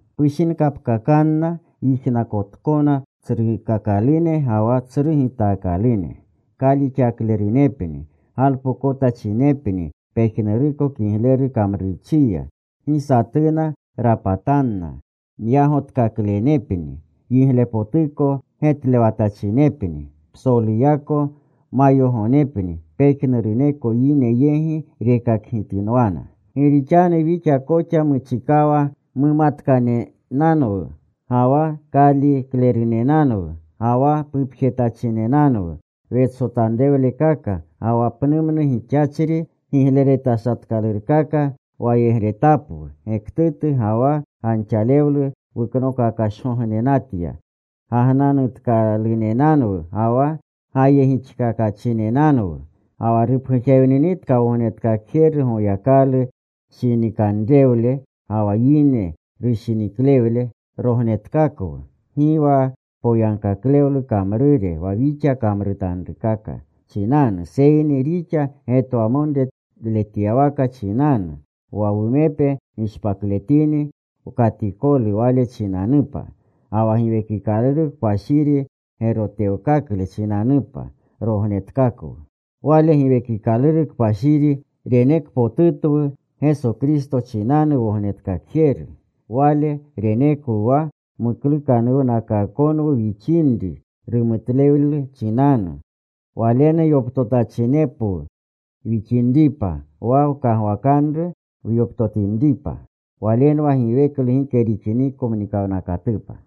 Pushinkapkakanna yijnakotkona tsrukakalune ga wa tsru gitaakalune. Kalixaklerunepni. Galpokotachinepni pejnuruko kigleru kamrurchiya. Gi satuna rapatanna. Myagotkakaklenepni. Yiglepotuko getlewatachinepni. Psoluyako mayogonepni pejnuruneko yine yegi rekakgitinwana. Gi rixanu wixa koxa muchikawa mumatkanenanwu, ga wa kaalirewaklerunenanwu, ga wa pupjetachinenanwu. Wetsotanrewlekaka ga wa pnumnu gixachri gigleretashatkalurkaka wayegretapwu. Gektutu ga wa ganxalewlu wuknokakashgognenatya. Gagnanutkalunenanwu ga wa gayegixkakanatachinwu. Ga wa rupgujewninitka Wognetkakjeru Goyakalu shinikanrewle ga wa yine rushiniklewle, rognetkakwu gi wa poyagkaklewlu kamrure wa wixa kamrutanrukaka chinanu, seyni rixa getwamonrewletyawaka chinanu. Wa wumepe gishpakletini wkatikolu Wale chinanupa, ga wa Giwekikaluru Kpashiri gerotewkakle chinanupa, rognetkakwu. Wale Giwekikaluru Kpashiri renekpotutwu Geso Kristo chinanu Wognetkakjeru. Wale renekwu wa muklukanuwnakaakonwu wixinri rumutlewle chinanu, Walenu yoptotachinwu wixinripa, wa wkagwakanru wyoptotinripa. Walenwa giweklu gike rixiniko mnikawnakatupa.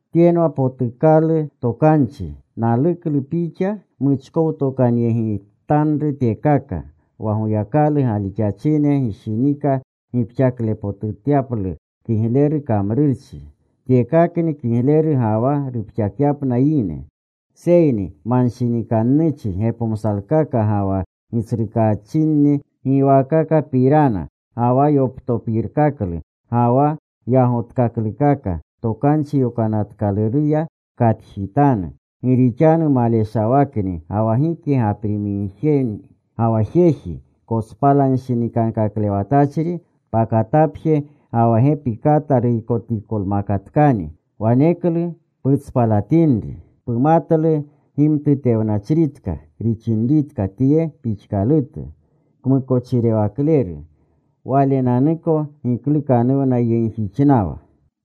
Tyenwa potukalu tokanchi. Naluklu pixa muchkowtokanyegitanru tyekaka, wa Goyakalu galixachine gishinika gipxaklepotutyaplu kigleru kamrurchi. Tyekakni kigleru ga wa rupxakyapna yine. Seyni manshinikannuchi gepomsalkaka ga wa gitsrukaachinni giwaakakapirana, ga wa yoptopirkaklu ga wa yagotkaklukaka Tokanchi Yokanatkaluruya pkatjitanu. Gi rixanu maleshawakni ga wa gike gaprimigjeni. Ga wa jeji kotspaltanshinikankaklewatachri pakatapje ga wa gepi kata ruykotikolmakatkani, waneklu putspalatinri. Pumatlu gimtutewnachritka rixinritka tye pixkalutu. Kmukochirewakleru. Walenanuko giklukanuwnayegjixnawa.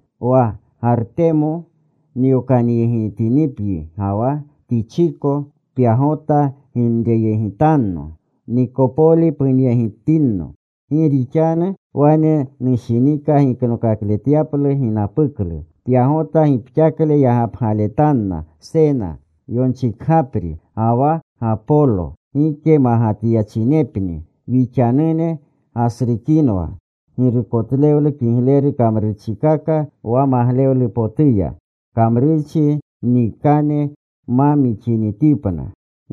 Wa Gartemo nyokanyegitinipyi ga wa Tichiko, pyagota ginreyegitanno. Nikopoli punyegitinno. Gi rixanu wane nushinika giknokakletyalu ginapuklu. Pyagota gipxakle yagapletanna Sena, yonchikgapri, ga wa Gapolo. Gike magatyachinepni. Wixanune gasrukinwa girukotletlu kigleru kamrurchikaka wa maglewlupotuya, kamrurchi mwikane ma mixinitipna.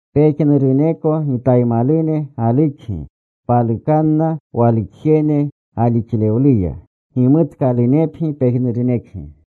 Pejnuruneko gitaymalune galukyi. Palukanna walukjene galixlewluya. Gimutkalunepgi pejnurunekgi.